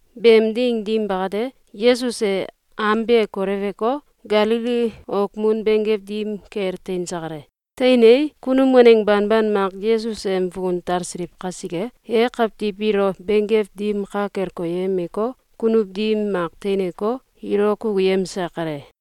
Beem ding dim bakate, Yesus e am be koleweko, Galili okmun benggew dim kel teinse kale. Teinei, kunum waneng banban mak Yesus em fukun talsiliw kasike, e kawtiw biilo benggew dim ka kel koyemeko, kunuw dim mak teineko, ilo kukuyemse kale.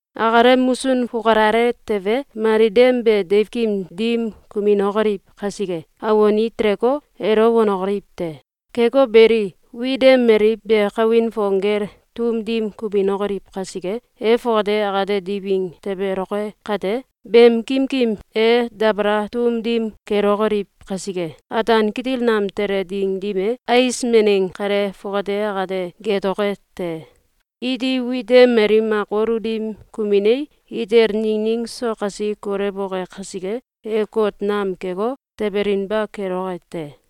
akalem musun fukalale tewe, mali dem be deiwkim dim kuminokoliw kasike, awon i teleko, elo wanokoliw te. Keko beli, wit dem mali be kawin fong gel tum dim kuminokoliw kaiske, e fongate akate diwing tebeloke kate, beem kimkim e dabala tum dim kelokoliw kasike, ataan kitil nam tele ding dim e, ais meneng kale fongate akate geetoke te. Iti wit dem mali mak wolu dim kuminei, itel ningning so kasi kolewoke kasike, e kot nam keko, tebelinba keloke te.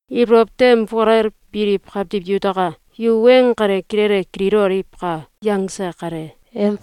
Ibolow tem fukalel biliw kawtiw yutaka! Yu weng kale kilele kililoliwka!”, yangse kale.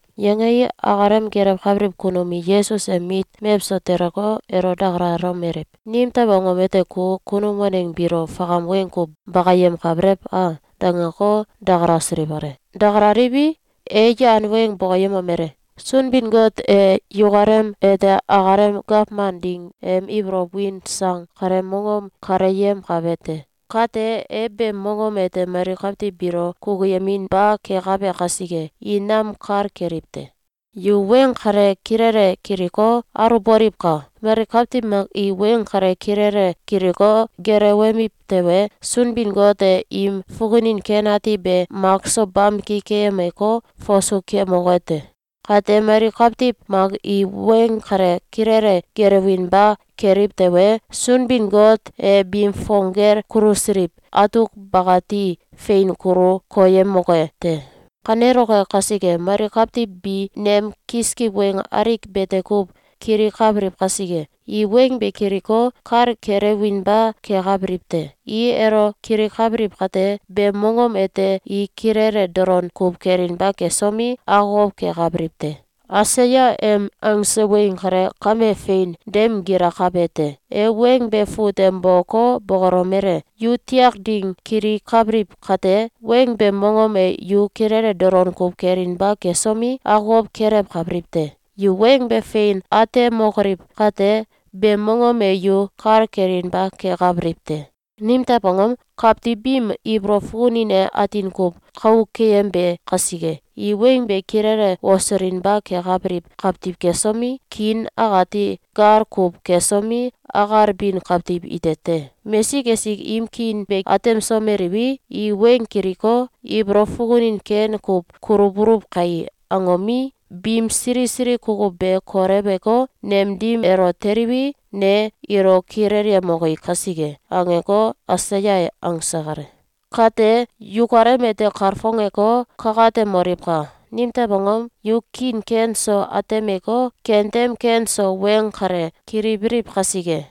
Yangei, akalem gelewkabiliw kunum i Yesus em mit mewso teleko, elo dakalalomeliw: “Nimtew angom ete ku kunum waneng biilo fakam weng kuw bakayemkabelew a?”, dangeko, dakalasiliw kale. Dakalaliwi, e yan weng bokoyemomele: “Sunbin-Got e yukalem ete akalem gawman ding em ibolow win sang kaleem mongom kaleyemkabe te. Kate, e beem mongom ete mali kawtiw biilo kukuyeminba kekabe kasike, i nam kal keliw te. Yu weng kale kilele kiliko, aluwboliwka! Mali kawtiw mak i weng kale kilele kiliko, gelewemiw tewe, Sunbin-Got e im fukunin ken ati be makso bamki keyemeko, fasu kemoke te. Kate mali kawtiw mak i weng kale kilele gelewinba keliw tewe, Sunbin-Got e biim fong gel kulusiliw atuk bakati fein kulu koyemoke te. Kaneloke kasike, mali kawtiw bi nem kiskiw weng alik bete kuw kilikabiliw kasike, ‘I weng be kiliko, kal kelewinba kekabiliw te. I elo kilikabiliw kate, beem mongom ete i kilele dolon kuw kelinba kesomi, akokow kekabiliw te.’ Aisaya em angse weng kale kame fein dem gilakabe te. E weng be fut tem boko, bokolomele: ‘Yu tiak ding kilikabiliw kate, weng beem mongom e yu kilele dolon kuw kelinba kesomi, akokow kelewkabiliw te. Yu weng be fein atemokoliw kate, beem mongom e yu kal kelinba kekabiliw te. Nimtew angom? Kawtiw biim ibolow fukunin e atin kuw kou keyembe kasike. I weng be kilele wosulinba kekabiliw kawtiw kesomi, kiin akati gal kuw kesomi, akalbin kawtiw ite te. Mesik esik im kiin be atemsomeliwi, i weng kiliko, ‘Ibolow fukunin ken kuw kulubuluw kai!’, angomi, biim sili sili kukuw be koleweko, nem dim elo teliwi, ne ilo kilelyemoki kasike.’, angeko, Aisaya e angse kale. Kate, yukalem ete kalfongeko, kakatemoliwka! Nimtew angom? Yu kiin ken so atemeko, kentem ken so weng kale kilibiliw kasike.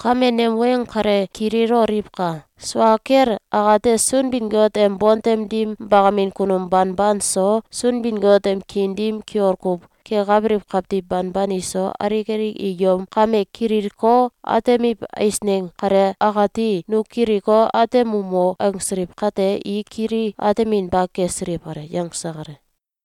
Kame nem weng kale kililoliwka! Sua kel akate, Sunbin-Got em bontem dim bakamin kunum banban so, Sunbin-Got em kiin dim kiol kuw kekabiliw kawtiw banban iso, alik alik i yom kame kililko, atemiw eisneng kale akati “Nu kiliko, atemumo!”, angsiliw kate, i kili ateminba kesiliw kale.”, yangse kale.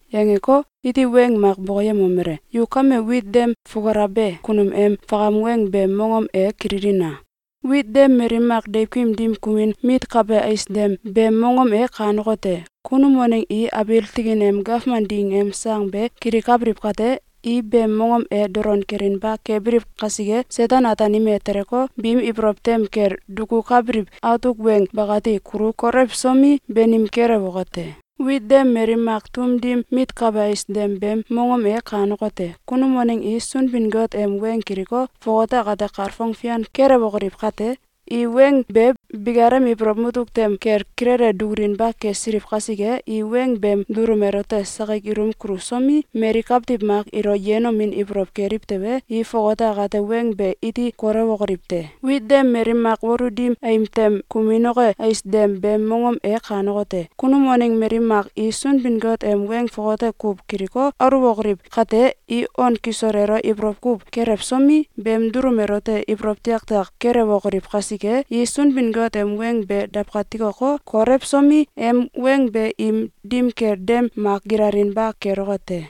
Yangeko, iti weng mak bokoyemomele: “Yu kame wit dem fukulabe kunum em fakam weng beem mongom e kililina! Wit dem mali mak deiwkim dim kumin mitkabe ais dem beem mongom e kanekote: Kunum waneng i abiil tikin em gawman ding em sang be kilikabiliw kate, i beem mongom e dolon kelinba kebiliw kasike, Seten-Ataanim e teleko, biim ibolow tem kel dukukabiliw atuk weng bakati kulu kolewsomi, banim kelewoke te. Wit dem mali mak tum dim mitkabe ais dem beem mongom e kanekote: Kunum waneng i Sunbin-Got em weng kiliko, fongate akate kalfong fian kelewokoliw kate, i weng be bikalem ibolow mutuk tem kel kilele dukulinba kesiliw kasike, i weng beem dulum elote sakik ilum kulusomi, mali kawtiw mak ilo yenomin ibolow keliw tewe, i fongate akate weng be iti kolewokoliw te. Wit dem mali mak wolu dim aim tem kuminoke ais dem beem mongom e kanekote: Kunum waneng mali mak i Sunbin-Got em weng fongate kuw kiliko, aluwokoliw kate, i on kisol elo ibolow kuw kelewsomi, beem dulum elote ibolow tiaktiak kelewokoliw kasike, i Sunbin-Got em weng be dawkatikoko, kolewsomi, em weng be im dim kel dem mak gilalinba keloke te.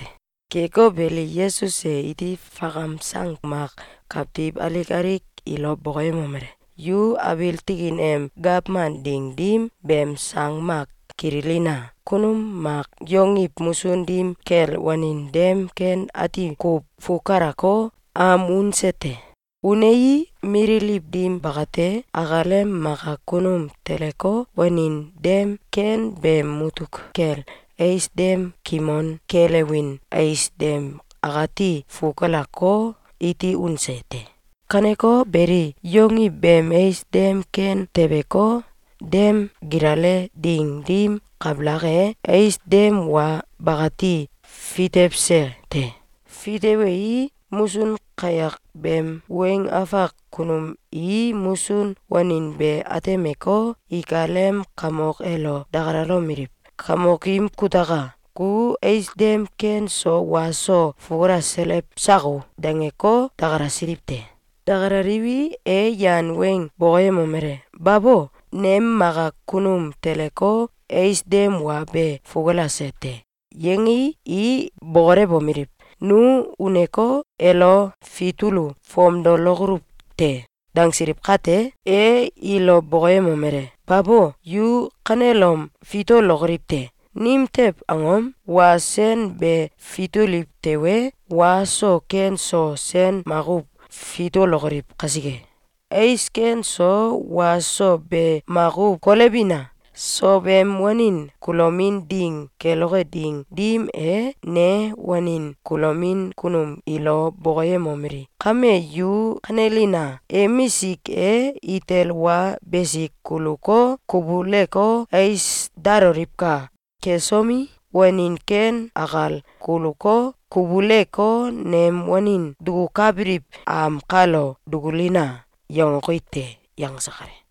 Keko beli, Yesus e iti fakam sang mak kawtiw alik alik ilo bokoyemomele: “Yu abiil tikin em gawman ding dim beem sang mak kililina! Kunum mak yongiw musun dim kel wanin dem ken ati kuw fukalako, am unse te. Unei, mililiw dim bakate, akalem maka kunum teleko, wanin dem ken beem mutuk kel ais dem kimon kelewin ais dem akati fukalako, iti unse te. Kaneko beli, yongiw beem ais dem ken tebeko, dem gilale ding dim kabalak e, ais dem wa bakati fitewse te. Fitewei, musun kayak beem weng afak kunum i musun wanin be atemeko, ikalem kamok elo dakalalomeliw: ‘Kamokim kutaka! Ku ais dem ken so wa so fukalaselew sako?’, dangeko, dakalasiliw te. Dakalaliwi, e yan weng bokoyemomele: ‘Babo! Nem maka kunum teleko, ais dem wa be fukulase te.’, yangei, i bokolewomeliw: ‘Nu uneko, elo fitulu fomdolokoluw te.’, dangsiliw kate, e ilo bokoyemomele: ‘Babo! Yu kanelom fitulokoliw te! Nimtew angom? Wa sen be fituliw tewe, wa so ken so sen makuw fitulokoliw kasike. Ais ken so wa so be makuw kolewbina! Sow em wanin kulomin ding keloke ding dim e, ne wanin kulomin kunum ilo bokoyemomeli: ‘Kame yu kanelina! Emisik e itel wa besik kuluko, kubuleko, ais daloliwka! Kesomi, wanin ken akal kuluko, kubuleko, nem wanin dukukabiliw am kalo dukulina!’, yangoki te.”, yangse kale.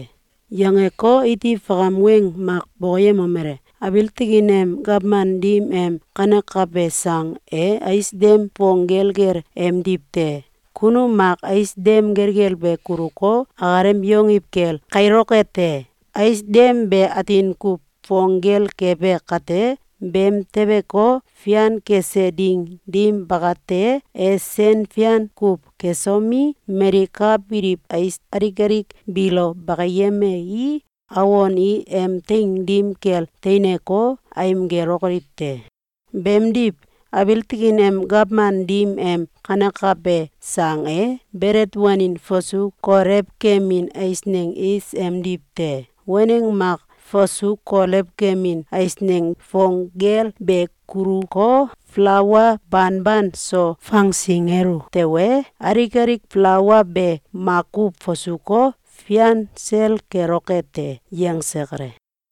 Yangeko, iti fakam weng mak bokoyemomele: “Abiil tikin em gawman dim em kanekabe sang e ais dem fong gelgel emdiw te. Kunum mak ais dem gelgel be kuluko, akalem yongiw kel kailoke te. Ais dem be atin kuw fong gel kebe kate, beem tebeko, fian kese ding dim bakate, e sen fian kuw kesomi, mali ka biliw ais alik alik biilo bakiyemei, awon i em teing dim kel teineko, aim gelokoliw te. Beemdiw, abiil tikin em gawman dim em kanekabe sang e belet wanin fasu kolew kemin eisneng is emdiw te. Waneng mak fasu kolew kemin eisneng fong gel be kuluko, falaua banban so fangsingelu tewe, alik alik falaua be makuw fasuko, fian sel keloke te.”, yangse kale.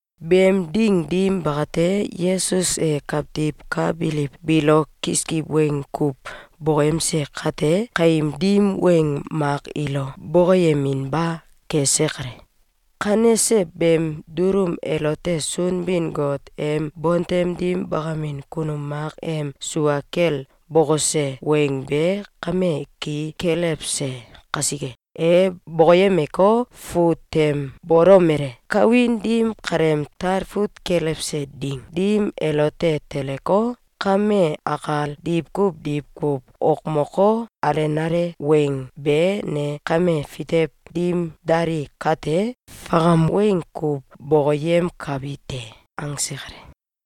Beem ding dim bakate, Yesus e kawtiw ka biliw biilo kiskiw weng kuw bokoyemse kate, kaim dim weng mak ilo bokoyeminba kese kale. Kanese beem dulum elote Sunbin-Got em bontem dim bakamin kunum mak em sua kel bokose weng be kame ki kelewse kasike. E bokoyemeko, fut tem bolomele: “Kawin dim kaleem talfut kelewse ding dim elote teleko, kame akal, diwkuw diwkuw okmoko, alenale weng be ne kame fitew dim dali kate, fakam weng kuw bokoyemkabi te.”, angse kale.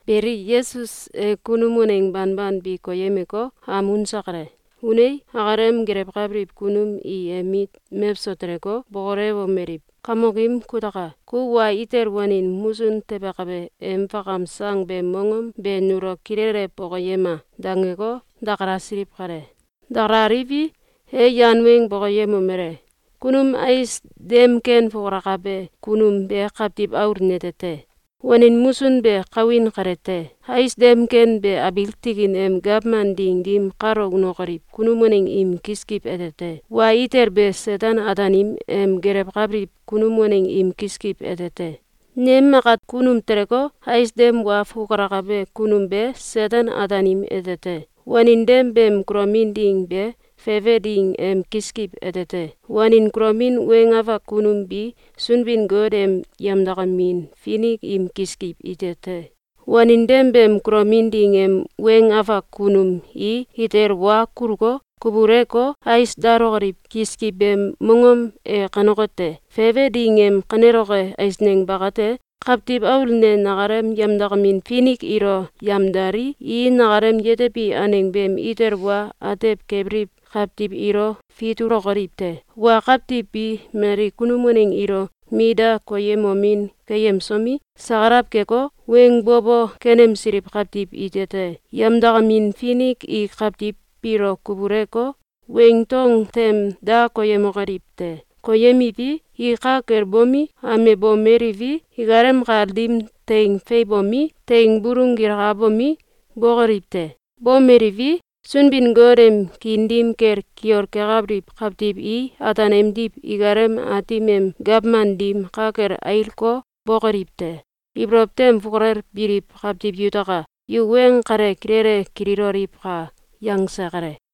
Beli, Yesus e kunum waneng banban bi koyemeko, am unse kale. Unei, akalem gelewkabiliw kunum i em mit mewso teleko, bokolewomeliw: “Kamokim kutaka! Ku wa itel wanin musun tebekabe em fakam sang beem mongom be nulo kilele bokoyema!”, dangeko, dakalasiliw kale. Dakalaliwi, e yan weng bokoyemomele: “Kunum ais dem ken fukalabe kunum be Kawtiw Aul nete te. Wanin musun be kawin kale te. Ais dem ken be abiil tikin em gawman ding dim kalo unokoliw kunum waneng im kiskiw ete te. Wa itel be Seten-Ataanim em gelewkabiliw kunum waneng im kiskiw ete te. Nem maka kunum teleko, ais dem wa fukalabe kunum be Seten-Ataanim ete te. Wanin dem beem kulomin ding be fefe ding em kiskiw ete te. Wanin kulomin weng afak kunum bi Sunbin-Got em yemdakamin finik im kiskiw ite te. Wanin dem beem kulomin ding em weng afak kunum i itel wa kuluko, kubuleko, ais dalokoliw kiskiw beem mongom e kanekote: Fefe ding em kaneloke eisneng bakate. Kawtiw Aul ne nakalem yemdakamin finik ilo yemdalii, i nakalem yetebi aneng beem itel wa atew kebiliw kawtiw ilo fitulokoliw te. Wa kawtiw bi mali kunum waneng ilo mit da koyemomin keyemsomi, sakalaw keko, weng bo bo kenemsiliw kawtiw ite te. Yemdakamin finik i kawtiw biilo kubuleko, weing dong tem da koyemokoliw te. Koyemiwi, i ka kel bomi, amebomeliwi, ikalem kal dim teing feiwbomi, teing bulung gilkabomi, bokoliw te. Bomeliwi, Sunbin-Got em kiin dim kel kiol kekabiliw kawtiw i ataan emdiw ikalem Aatim em gawman dim ka kel ailko, bokoliw te. Ibolow tem fukalel biliw kawtiw yutaka! Yu weng kale kilele kililoliwka!”, yangse kale.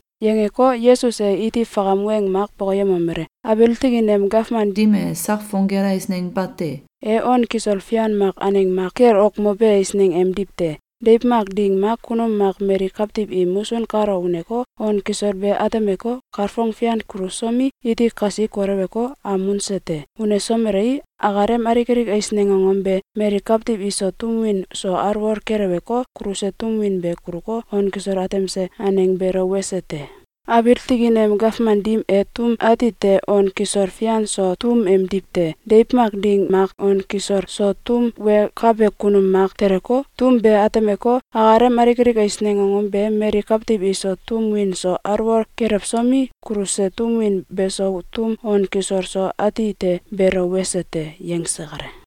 Yangeko, Yesus e iti fakam weng mak bokoyemomele: “Abiil tikin em gawman dim e sak fong gel eisneng bate. E on kisol fian mak aneng mak kel okmobe eisneng emdiw te. Deiw mak ding mak kunum mak mali kawtiw im musun kalo uneko, on kisol be atemeko, kalfong fian kulusomi, iti kasi koleweko, am unse te. Unesomelei, akalem alik alik eisneng angom be mali kawtiw iso tum win so alwol keleweko, kuluse tum win be kuluko, on kisol atemse aneng beelo wese te. Abiil tikin em gawman dim e tum ati te on kisol fian so tum emdiw te. Deiw mak ding mak on kisol so tum wenkabe kunum mak teleko, tum be atemeko, akalem alik alik eisneng angom be mali kawtiw iso tum win so alwol kelewsomi, kuluse tum win beso tum on kisol so ati te beelo wese te.”, yangse kale.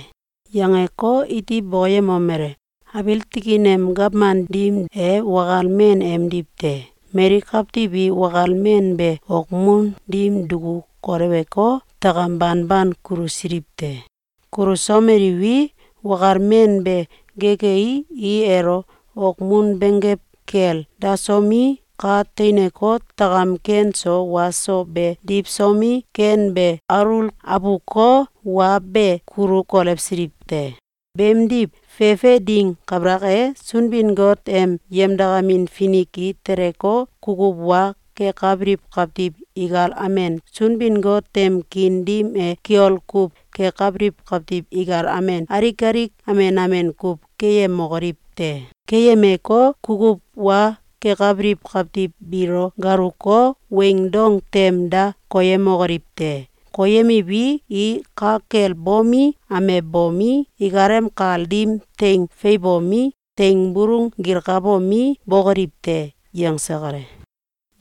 Yangeko, iti bokoyemomele: “Abiil tikin em gawman dim e wakal men emdiw te. Mali kawtiw i wakal men be okmun dim duku kolewko, takam banban kulusiliw te. Kulusomeliwi, wakal men be gekei, i elo okmun benggew kel dasomi, ka teineko, takam ken so wa so be diwsomi, ken be alul abuko, wa be kulu kolewsiliw te. Beemdiw, fefe ding kabalak e, Sunbin-Got em yemdakamin finik i teleko, kukuw wa kekabiliw kawtiw ikal amen, Sunbin-Got em kiin dim e kiol kuw kekabiliw kawtiw ikal amen, alik alik amen amen kuw keyemokoliw te. Keyemeko, kukuw wa kekabiliw kawtiw biilo galuko, weing dong tem da koyemokoliw te. Koyemiwi, i ka kel bomi, amebomi, ikalem kal dim teing feiwbomi, teing bulung gilkabomi, bokoliw te.”, yangse kale.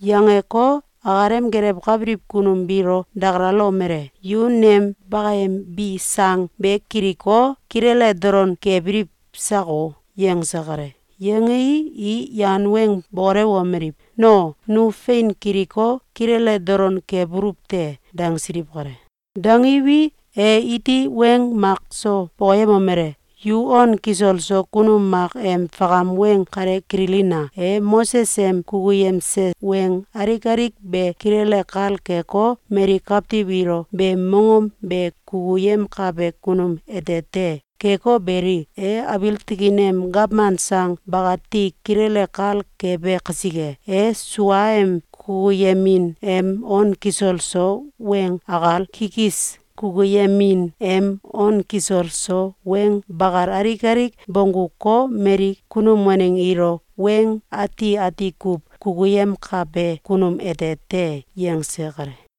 Yangeko, akalem gelewkabiliw kunum biilo dakalalomele: “Yu nem bakayembi sang be kiliko, kilele dolon kebiliw sako?”, yangse kale. Yangei, i yan weng bokolewomeliw: “No, nu fein kiliko, kilele dolon kebuluw te!”, dangsiliw kale. Dangiwi, e iti weng mak so bokoyemomele: “Yu on kisol so kunum mak em fakam weng kale kililina! E Moses em kukuyemse weng alik alik be kilele kal keko, mali kawtiw ilo beem mongom be kukuyemkabe kunum ete te. Keko beli, e abiil tikin em gawman sang bakati kilele kal kebe kasike, e suaem kukuyemin em on kisol so weng akal, kikis kukuyemin em on kisol so weng bakal alik alik bongguko, mali kunum waneng ilo weng ati ati kuw kukuyemkabe kunum ete te.”, yangse kale.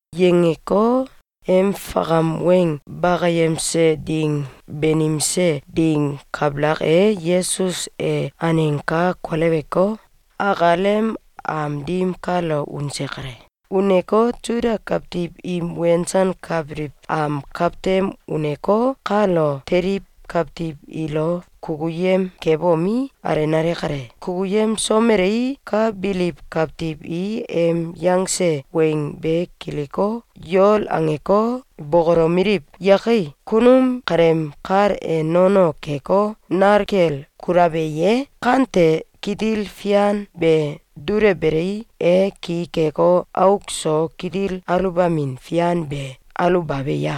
Yangeko, em fakam weng bakayemse ding banimse ding kabalak e, Yesus e aneng ka koleweko, akalem am dim kalo unse kale. Uneko, Suda kawtiw im wensankabiliw am kawtem uneko, kalo teliw kawtiw ilo kukuyem kebomi, alenale kale. Kukuyemsomelei, ka biliw kawtiw i em yangse weng be kiliko, yol angeko, bokolomeliw: “Yakai! Kunum kaleem kal e nono keko, nal kel kulabe ye? Kante kitil fian be dulewbelei, e ki keko, auk so kitil aluwbamin fian be aluwbabe ya?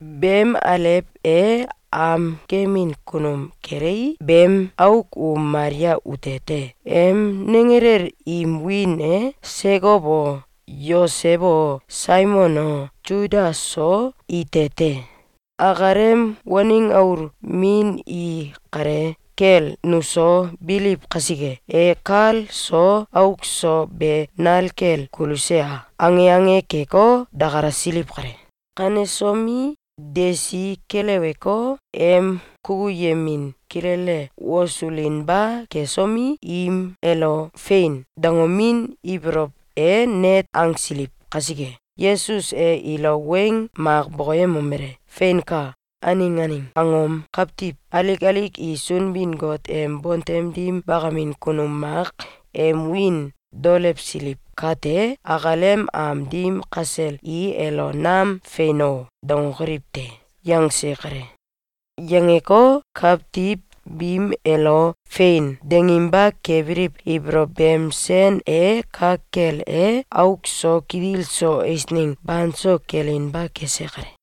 Beem alew e am gemin kunum kelei, beem auk u Malia ute te. Em nenggelel im wiin e Sekow o, Yosew o, Saimon o, Suda so ite te. Akalem waneng aul min i kale kel nuso biliw kasike, e kal so auk so be nal kel kuluse a?”, ange ange keko, dakalasiliw kale. Kanesomi, desi keleweko, em kukuyemin kilele wosulinba kesomi, im elo “Fein!”, dangomin ibolow e net angsiliw kasike, Yesus e ilo weng mak bokoyemomele: “Feinka! Aneng aneng angom kawtiw alik alik i Sunbin-Got em bontem dim bakamin kunum mak em wiin daolewsiliw kate, akalem am dim kasel i elo nam ‘Fein o!’, dangokoliw te!”, yangse kale. Yangeko, kawtiw biim elo “Fein!”, danginba kebiliw ibolow beem sen e ka kel e, auk so kitil so eisneng banso kelinba kese kale.